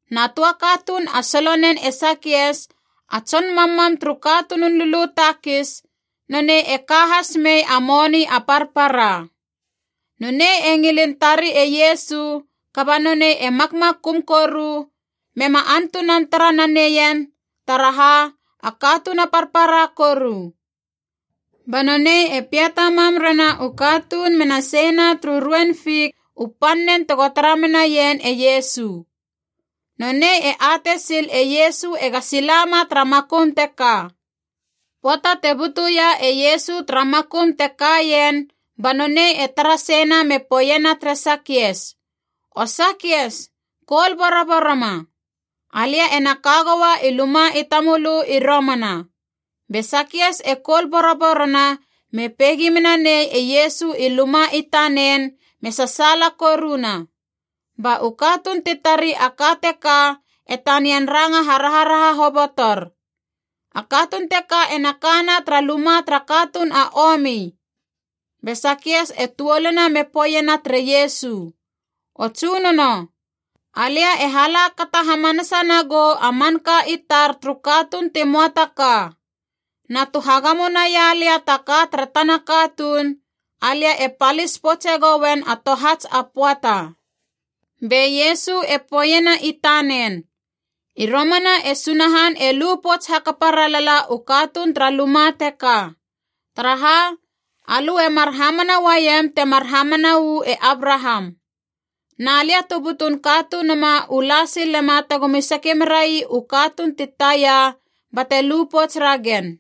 Na töa katuun a solonen e Sakias a tson mammam turu katunun lulu takis, nonei e ka has mei a moni a parpara. Nonei e ngilin tari e Iesu, kaba nonei e makmakum koru mema antunan tara na neien taraha, a katuun a parpara koru. Ba nonei e piata mam rena u katuun mena seina turu ruein fik u pannen tego tara menaien e Iesu. Nonei e atei sil e Iesu ega sila ma tara makum teka. Pöata te butuia e Iesu tara makum te kaien ba nonei e tara seina me poeiena tere Sakias, “O Sakias, koul boroboroma. Alia ena ka goua i luma i tamölö i romana.” Be Sakias e koul boroborona me peigi mena nei e Iesu i luma i tanen me sasaala koruna. Ba u katuun ti tari a ka teka e tanian ranga haraharaha hobotor, “A katuun teka ena kana tara luma tara katuun a omi!” Be Sakias e tuoluna me poeiena tere Iesu, “O Tsunono! Alia e hala kata hamanasa nagou a manka i tar turu katuun ti möa ta ka! Na tu hagamo naia lia ta ka tara tana katuun, alia e palis poutse goen a tohats a pöata!” Be Iesu e poeiena i tanen, “I romana e Sunahan e lu pouts hakapa ralala u katuun tara luma teka. Taraha? Alö e mar hamana uaiem temar hamana uu e Abraham. Na lia tu butun Katunuma u la silema tegomi sake merai u katuun ti taia bate lu pouts ragen.”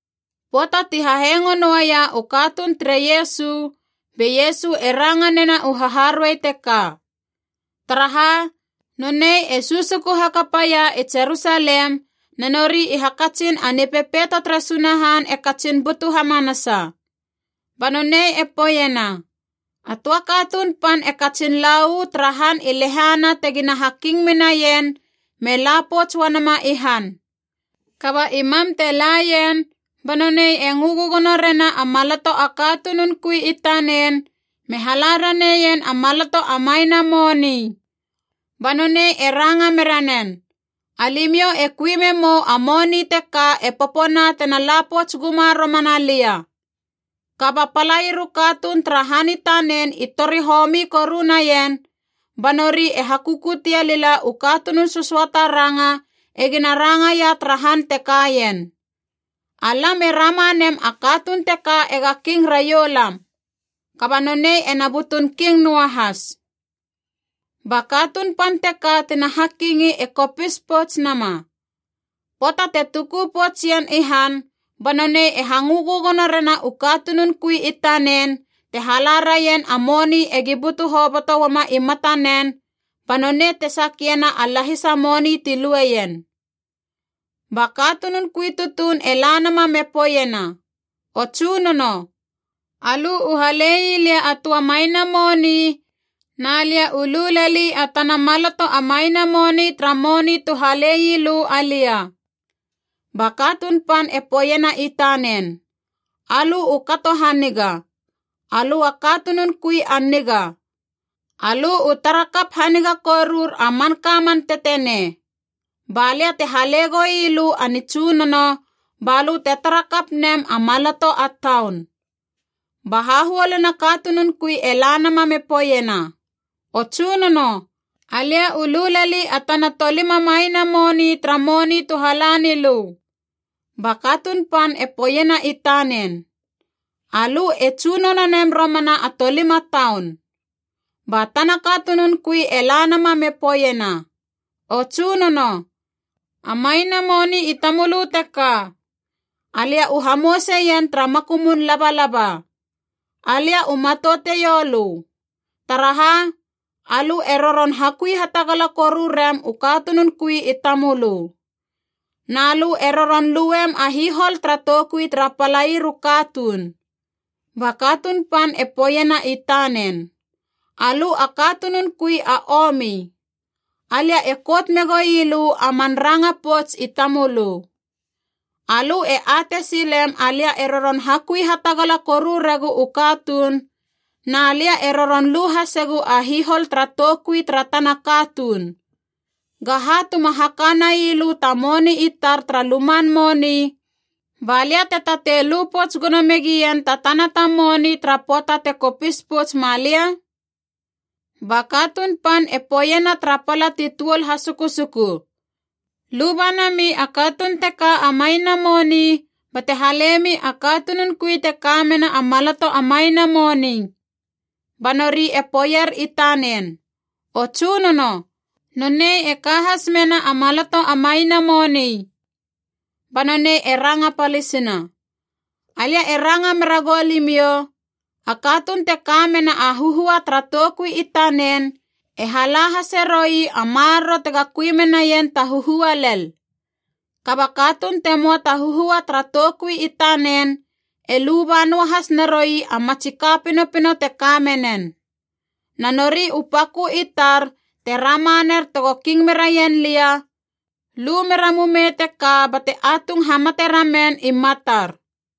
Pöata ti hahengo nouaia u katuun tere Iesu, be Iesu e ranga nena u haharuei teka. Taraha, Nonei e susuku hakapaia i Jerusalem, na nori i hakatsin a Nipepeito tere Sunahan e katsin butu hamanasa. Ba nonei e poeiena, “A töa katuun pan e katsin la uu tara han i lehana tegina haking menaien me la pouts uanama i han. Kaba i mam te laien, ba nonei e ngö gögono rena a maloto a katunun kui i tanen me hala raneien a maloto a maina moni.a Ba nonei e ranga mera nen, ‘Alimiou e kui memou a moni teka e popona tena la pouts guma romana lia.’ Kaba palair u katuun tara han i tanen i tori homi koru naien, ba nori e hakukutie lila u katunun sösöata ranga egina rangaia tara han te kaien, ‘Alam e rama nem a katuun teka ega king raiou lam.’ Kaba nonei ena butun king noa has. “Ba katuun pan teka tina hakingi e kopis pouts nama. Pöata te tuku poutsien i han ba nonei e hangö gögono rena u katunun kui i tanen te hala raien a moni egi butu hoboto uama i matanen ba nonei te sakiena a lahisa moni ti lueien. Ba katunun kui tutuun e la nama me poeiena, ‘O tsunono, alö u halei lia a töa maina moni, na lia u lu leli a tana maloto a maina moni tara moni tu halei lö alia!’ Ba katuun pan e poeiena i tanen, ‘Alö u kato haniga. Alö a katunun kui a niga! Alö u tara kap haniga korur a manka man tetenei. Ba lia te hale goi lö a nitsunono ba lö te tara kap nem a maloto a taun!’ Ba hahuoluna katunun kui e la nama me poeiena, ‘O Tsunono, alia u lu leli a tana tolima maina moni tara moni tu hala nilö.’ Ba katuun pan e poeiena i tanen, ‘Alö e tsunono nem romana a tolima taun.’ Ba tana katunun kui e la nama me poeiena, ‘O Tsunono, a maina moni i tamölö teka. Alia u hamouseien tara makumun labalaba. Alia u matouteiou lö. Taraha? Alö e roron hakui hatagala koru rem u katunun kui i tamölö. Na lö e roron luem a hihol tara toukui tara palair u katuun.’ Ba katuun pan e poeiena i tanen, ‘Alö a katunun kui a omi! Alia e kout megoi lö a man ranga pouts i tamölö! Alö e atei silem alia e roron hakui hatagala koru regu u katuun, na lia e roron lu hasegu a hihol tara toukui tara tana katuun. Gaha tu ma haka naialö ta moni i tar tara luman moni, ba lia te tatei lu pouts gono megien ta tana ta moni tara pöata tego kopis pouts malia?’ Ba katuun pan e poeiena tara pala ti tuol hasukusuku, ‘Luba nami a katuun teka a maina moni bate halemi a katunun kui te ka mena a maloto a maina moni.’ Ba nori e poeier i tanen, ‘O Tsunono, nonei e ka has mena a maloto a maina moni!’ Ba nonei e ranga palisina, ‘Alia e ranga mera goulimiou, a katuun te ka mena a huhua tara toukui i tanen e hala hase roui a maroro tega kui menaien ta huhua lel. Kaba katuun te möa ta huhua tara toukui i tanen e luba noa has naroui a matsi ka pinopino te ka menen. Na nori u pakö i tar te rama ner tego king meraien lia, lu mera mumei teka bate atung hamate ramen i matar!’”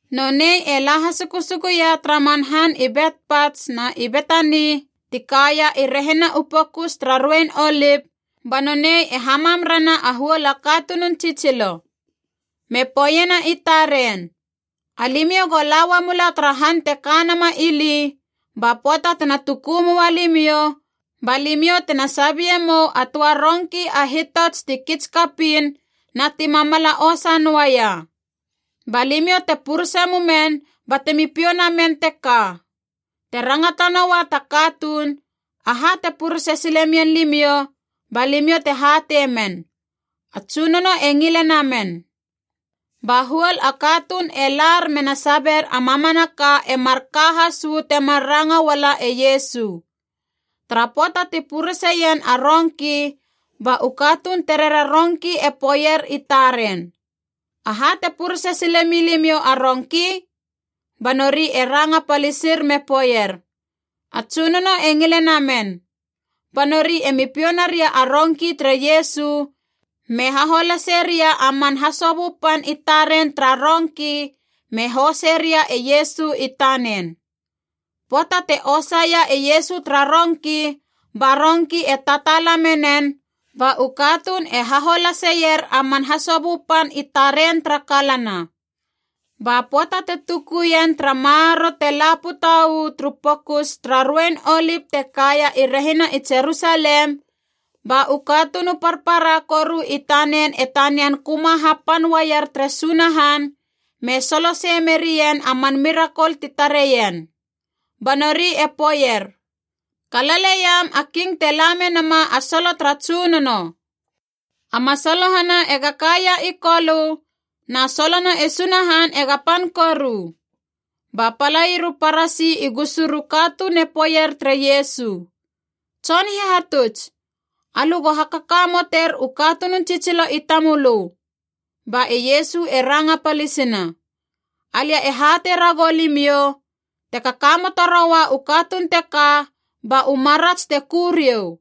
Nonei e la hasukusukuia tara man han i Betpats na i Betani ti kaia i rehina u Pokus tara Ruein Olip, ba nonei e hamam rena a huol a katunun tsitsilo. Me poeiena i taren, “Alimiou go la uamula tara han te ka nama ili, ba pöata tena tuku moa limiou ba limiou tena sabie mou a töa rongki a hitots ti kits kapiin na ti mamala osa noaia. Ba limiou te purese mumen batemi piou namen teka. Te rangata noua ta katuun, ‘Aha te purese sile mien limiou,’ ba limiou te hatei men, ‘A Tsunono e ngile namen.’” Ba huol a katuun e lar mena sabier a mamanaka e marka has uu temar ranga uala e Iesu. Tara pöata ti pureseien a rongki ba u katuun terera rongki e poeier i taren, “Aha te purese sile milimiou a rongki?” Ba nori e ranga palisir me poeier, “A Tsunono e ngile namen.” Ba nori e mi piou naria a rongki tere Iesu me haholase ria a man hasobö pan i taren tara rongki me hose ria e Iesu i tanen. Pöata te osaia e Iesu tara rongki ba rongki e tataala menen, ba u katuun e haholaseier a man hasobö pan i taren tara kalana. Ba pöata te tukuien tara maroro te la puta uu turu Pokus tara Ruein Olip te kaia i rehina i Jerusalem, ba u katuun u parpara koru i tanen e tanian köma hapan uaier tere Sunahan me solosei merien a man mirakol ti tareien. Ba nori e poeier: “Kalaleiam a king te la menama a solo tara Tsunono! A masalohana ega kaia i Kolö, na solona e Sunahan ega pan koru!” Ba palair u Parasi i gusur u katuun e poeier tere Iesu, “Tson Hihatuts, alö go hakakamoter u katunun tsitsilo i tamölö.” Ba e Iesu e ranga palisina, “Alia e hatei ragou limiou, te kakamoto roua u katuun teka ba u marats te ku riou!”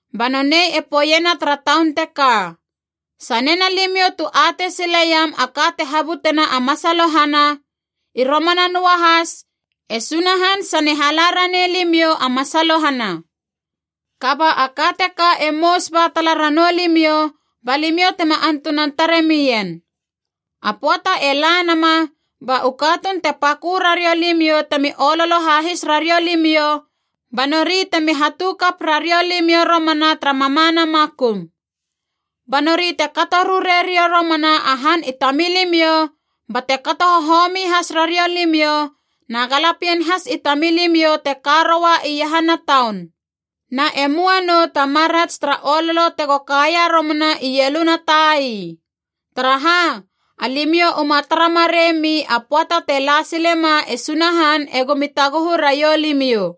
Ba nonei e poeiena tara taun teka, “Sanena limiou tu atei sileiam a ka te habutena a masalohana, i romana noa has, e Sunahan sane hala raneilimiou a masalohana. Kaba a ka teka e mous ba tala ranou limiou ba limiou tema antunan tare mien. A pöata e la nama, ba u katuun te pakö rariou limiou temi ololo hahis rariou limiou ba nori temi hatukap rariou limiou romana tara mamana makum. Ba nori te kato rure riou romana a han i tamilimiou bate kato hohomi has rariou limiou na galapien has i tamilimiou te ka roua iahana taun. Na e möa nou ta marats tara ololo tego kaia romana i ieluna tai. Taraha? Alimiou uma tara marei mi a pöata te la silema e Sunahan egomi taguhu raiou limiou!”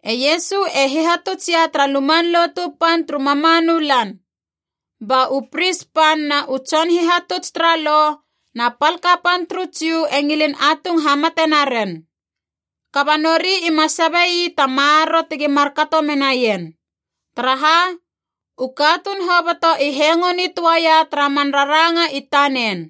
E Iesu e hihatuts ia tara Luman Lotu Pan turu mamanu lan. Ba u pris pan na u tson hihatuts tara Lo na pal kapan turu Jiu e ngilin atung hamate naren. Kaba nori ima sabe ii ta maroro tegi markato menaien. Taraha? U katuun hoboto i hengo nitöaia tara man raranga i tanen.